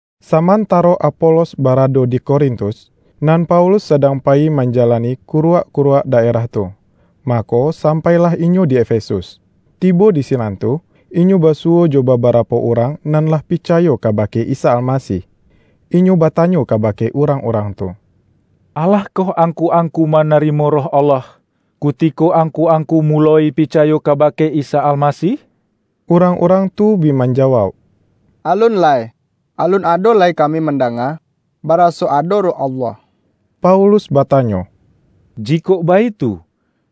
Samantaro Apolos barado di Korintus, nan Paulus sadang payi manjalani kuruak-kuruak daerah tu, mako sampailah inyo di Efesus. Tibo di sinan tu, inyo basuwo jo babarapo urang nan lah picayo kabake Isa Almasih. Inyo batanyo kabake urang-urang tu,”Alah koh angku-angku manarimo Roh Allah, kutiko angku-angku muloi picayo kabake Isa Almasih?” Urang-urang tu bi manjawauk,”Alun lai. Alun ado lai kami mandanga baraso ado Roh Allah.” Paulus batanyo,”Jikok baitu,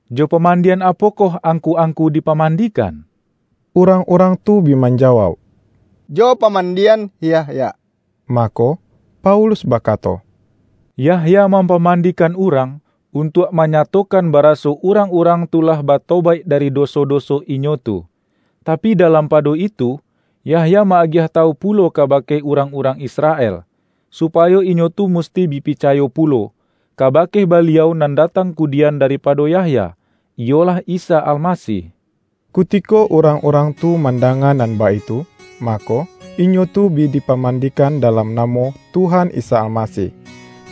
jo pamandian apokoh angku-angku dipamandikan?” Urang-urang tu bi manjawauk,”Jo pamandian Yahya.” Mako, Paulus bakato,”Yahya mampamandikan urang, untuak manyatokan baraso urang-urang tu lah batobaik dari doso-doso inyo tu. Tapi dalam pado itu, Yahya ma-agiah tawu pulo kabake urang-urang Israel, supayo inyo tu musti bi picayo pulo, kabake Baliau nan datang kudian daripado Yahya, iyolah Isa Almasih.” Kutiko urang-urang tu mandanga nan baitu, mako, inyo tu bi dipamandikan dalam namo Tuhan Isa Almasih.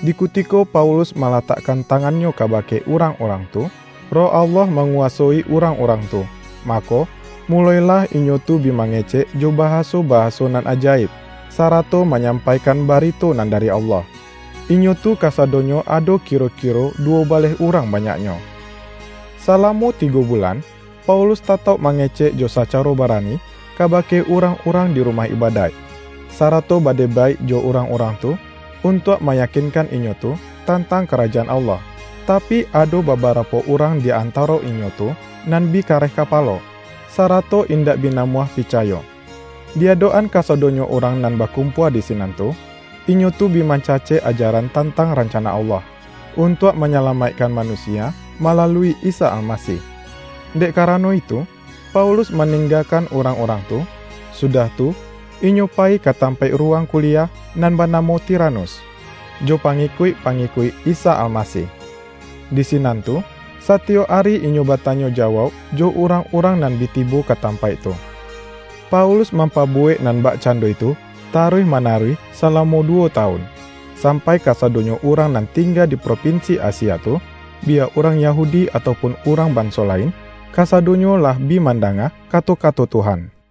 Di kutiko Paulus malatakkan tangannyo kabake urang-urang tu, Roh Allah manguwasoi urang-urang tu, mako, mulo-ilah inyo tu bi mangecek jo bahaso-bahaso nan ajaib, sarato manyampaikan barito nan dari Allah. Inyo tu kasadonyo ado kiro-kiro duwo baleh urang banyaknyo. Salamo tigo bulan, Paulus tatauk mangecek jo sacaro barani, kabake urang-urang di rumah ibadaik, sarato badebaik jo urang-urang tu untuak mayakinkan inyo tu, tantang Karajaan Allah. Tapi, ado babarapo urang di antaro inyo tu nan bi kareh kapalo, sarato indak bi namuah picayo. Di adok-an kasadonyo urang nan bakumpua di sinan tu, inyo tu bi mancacek ajaran tantang rancana Allah, untuak manyalamaikkan manusia malalui Isa Almasih. Dek karano itu, Paulus maninggakan urang-urang tu, sudah tu inyo payi ka tampaik ruwang kuliah nan banamo Tiranus, jo pangikuik-pangikuik Isa Almasih. Di sinan tu, satiyok ari inyo batanyo jawauk jo urang-urang nan bi tibo ka tampaik tu. Paulus mampabuwek nan bakcando itu taruih manaruih, salamo duwo tawun, sampai kasadonyo urang nan tingga di propinsi Asia tu, biya urang Yahudi atau pun urang banso lain, kasadonyo lah bi mandanga kato-kato Tuhan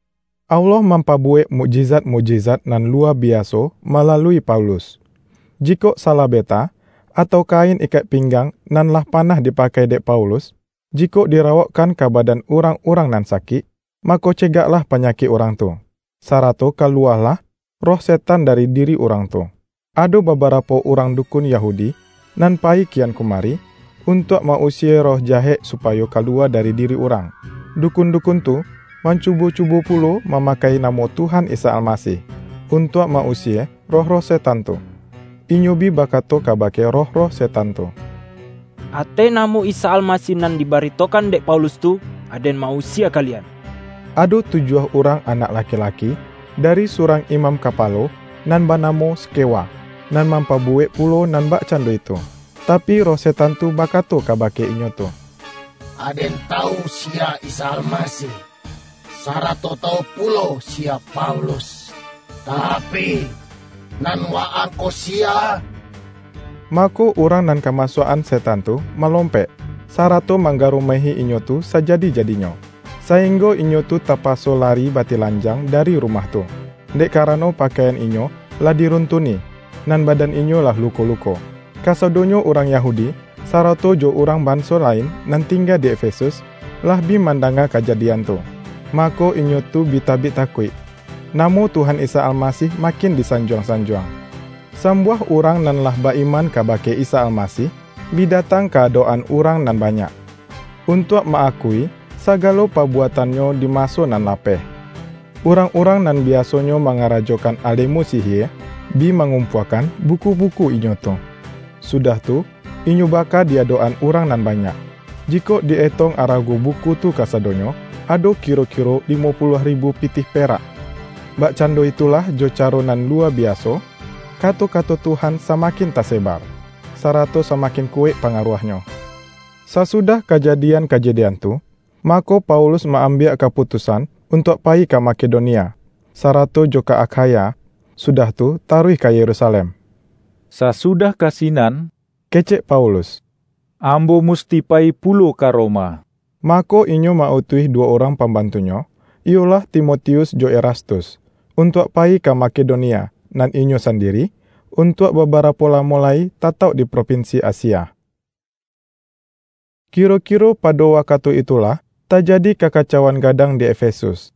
Allah mampabuwek mukjizat-mukjizat nan luwa biaso malalui Paulus. Jikok salabeta, atau kain ikek pinggang nan lah panah dipakai dek Paulus, jikok dirawokkan ka badan urang-urang nan sakik, mako cegaklah panyakik urang tu, sarato kaluwalah roh setan dari diri urang tu. Ado babarapo urang dukun Yahudi, nan payi kian kumari, untuak ma-usie roh jahek supayo kaluwa dari diri urang. Dukun-dukun tu, mancubo-cubo pulo mamakai namo Tuhan Isa Almasih, untuak ma-usie roh-roh setan tu. Inyo bi bakato kabake roh-roh setan tu,”Ateh namo Isa Almasih nan dibaritokan dek Paulus tu, aden ma-usie kalian!” Ado tujuah urang anak laki-laki, dari surang imam kapalo nan banamo Skewa, nan mampabuwek pulo nan bakcando itu. Tapi, roh setan tu bakato kabake inyo tu,”Aden tawu siya Isa Almasih, sarato tawu pulo siya Paulus, tapi, nan wa-ang ko siya?” Mako, urang nan kamasuak-an setan tu malompek, sarato manggarumehi inyo tu sajadi-jadinyo, sainggo inyo tu tapaso lari batilanjang dari rumah tu, dek karano pakaian inyo lah diruntuni, nan badan inyo lah luko-luko. Kasadonyo urang Yahudi, sarato jo urang banso lain nan tingga di Efesus, lah bi mandanga kajadian tu, mako, inyo tu bi tabik takuik. Namo Tuhan Isa Almasih makin disanjuang-sanjuang. Sambuah urang nan lah ba-iman kabake Isa Almasih, bi datang ka adok-an urang nan banyak, untuak ma-akui sagalo pabuatannyo di maso nan lapeh. Urang-urang nan biasonyo mangarajokan alemu sihie, bi mangumpuakan buku-buku inyo tu, sudah tu, inyo baka di adok-an urang nan banyak. Jikok di-etong arago buku tu kasadonyo, ado kiro-kiro limo puluah ribu pitih perak. Bakcando itulah jo caro nan luwa biaso, kato-kato Tuhan samakin tasebar, sarato samakin kuwaik pangaruahnyo. Sasudah kajadian-kajadian tu, mako Paulus ma-ambiak kaputusan untuak payi ka Makedonia, sarato jo ka Akhaya, sudah tu taruih ka Yerusalem.”Sasudah ka sinan,” kecek Paulus,”ambo musti payi pulo ka Roma.” Mako, inyo ma-utuih duwo urang pambantunyo, iyolah Timotius jo Erastus, untuak payi ka Makedonia, nan inyo sandiri, untuak babarapo lamo lai tatauk di propinsi Asia. Kiro-kiro pado wakatu itulah, tajadi kakacauan gadang di Efesus,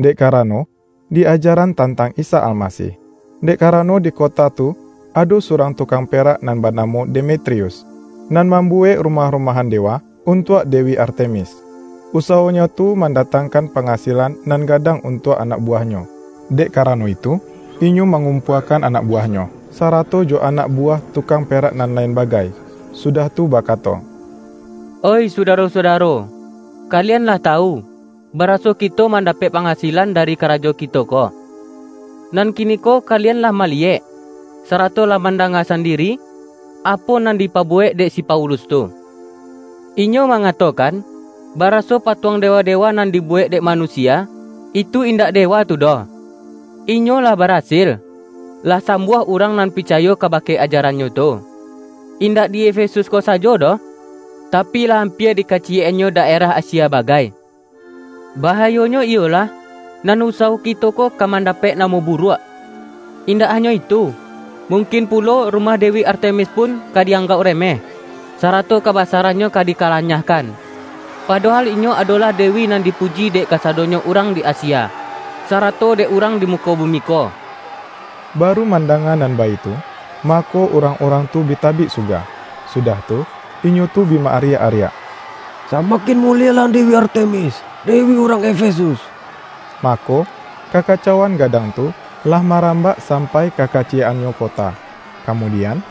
dek karano di ajaran tantang Isa Almasih. Dek karano dikota tu, ado surang tukang perak nan banamo Demetrius, nan mambuwek rumah-rumahan dewa untuak dewi Artemis. Usawonyo tu mandatangkan pangasilan nan gadang untuak anak buwahnyo. Dek karano itu, inyo mangumpuakan anak buwahnyo, sarato jo anak buwah tukang perak nan lain bagai, sudah tu bakato,”Oih sudaro-sudaro! Kalian lah tawu, baraso kito mandapek pangasilan dari karajo kito ko. Nan kiniko kalian lah maliyek, sarato lah mandanga sandiri, apo nan dipabuwek dek si Paulus tu. Inyo mangatokan baraso patuang dewa-dewa nan dibuwek dek manusia, itu indak dewa tu doh. Inyo lah barasil, lah sambuah urang nan picayo kabake ajarannyo tu, indak di Efesus ko sajo doh, tapi lah ampia di kaciyek-annyo daerah Asia bagai. Bahayonyo iyolah, nan usawo kito ko ka mandapek namo buruak. Indak hanyo itu, mungkin pulo rumah dewi Artemis pun ka di anggauk remeh, sarato kabasarannyo ka dikalanyahkan; padohal inyo adolah dewi nan dipuji dek kasadonyo urang di Asia, sarato dek urang di muko bumi ko!” Baru mandanga nan baitu, mako, urang-urang tu bi tabik suga, sudah tu, inyo tu bi ma-ariak-ariak,”Samakin mulielah dewi Artemis, dewi urang Efesus!” Mako, kakacauan gadang tu, lah marambak sampai ka kaciyek-annyo kota. Kamudian,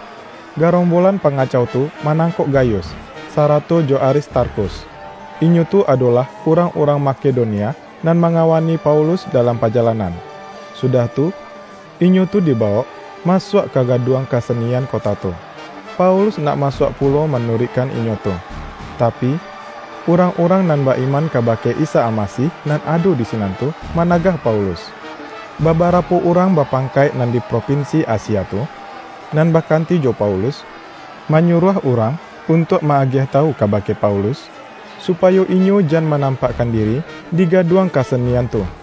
garombolan pangacau tu, manangkok Gayus, sarato jo Aristarkhus, inyo tu adolah urangurang Makedonia nan mangawani Paulus dalam pajalanan, sudah tu, inyo tu dibawok masuak ka gaduang kasenian kota tu. Paulus nak masuak pulo manuruikkan inyo tu, tapi, urang-urang nan ba-iman kabake Isa Almasih nan ado di sinan tu, managah Paulus. Babarapo urang bapangkaik nan di propinsi Asia tu, nan bakanti jo Paulus, manyuruah urang untuak ma-agiah tawu kabake Paulus, supayo inyo jan manampakkan diri di gaduang kasenian tu.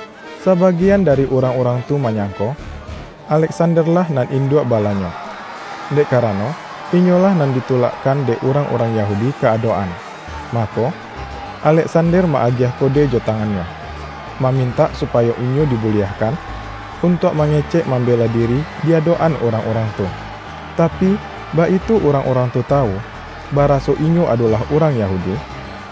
Sabagian dari urang-urang tu manyangko, Aleksander-lah nan induak balanyo, dek karano inyolah nan ditulakkan dek urang-urang Yahudi ka adok-an. Mako, Aleksander ma-agiah kode jo tangannyo, mamintak supayo inyo dibuliahkan, untuak mangecek mambela diri di adok-an urang-urang tu. Tapi, baitu urang-urang tu tawu, baraso inyo adolah urang Yahudi,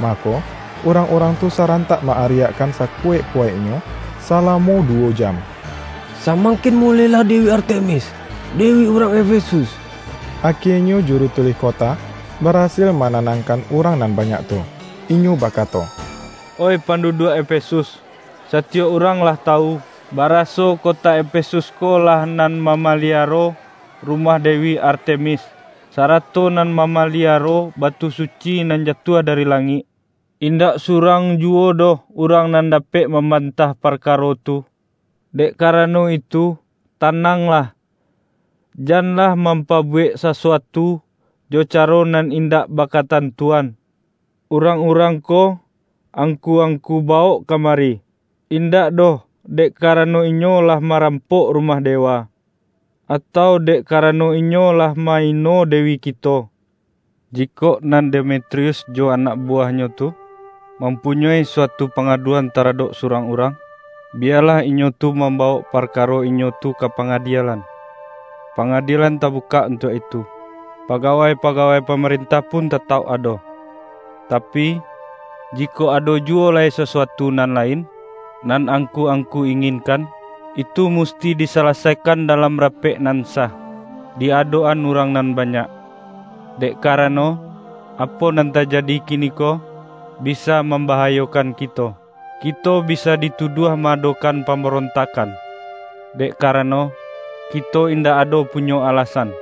mako, urang-urang tu sarantak ma-ariakkan sakuwaik-kuwaiknyo, salamo duwo jam,”Samangkin mulielah dewi Artemis, dewi urang Efesus!” Akienyo juru tulih kota, barasil mananangkan urang nan banyak tu. Inyo bakato,”Oih panduduak Efesus! Satiyok urang lah tawu, baraso kota Efesus ko lah nan mamaliaro rumah dewi Artemis, sarato nan mamaliaro batu suci nan jatuah dari langik. Indak surang juwo doh urang nan dapek mambantah parkaro tu. Dek karano itu, tananglah, janlah mampabuwek sasuatu jo caro nan indak bakatantuan. Urang-urang ko, angku-angku bawok kamari, indak doh dek karano inyo lah marampok rumah dewa, atau dek karano inyo lah ma-ino dewi kito. Jikok nan Demetrius jo anak buwahnyo tu, mampunyoi suatu pangaduan taradok surang urang, biyalah inyo tu mambawok parkaro inyo tu ka pangadielan. Pangadielan tabukak untuak itu, pagawai-pagawai pamarentah pun tatauk ado. Tapi, jikok ado juwo lai sasuatu nan lain, nan angku-angku inginkan, itu musti disalasaikan dalam rapek nan sah, di adok-an urang nan banyak. Dek karano, apo nan tajadi kiniko, bisa mambahayokan kito. Kito bisa dituduah ma-adokan pambarontakkan, dek karano, kito indak ado punyo alasan,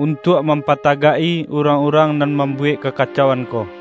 untuak mampatagak-i urang-urang nan mambuwek kakacauan ko.”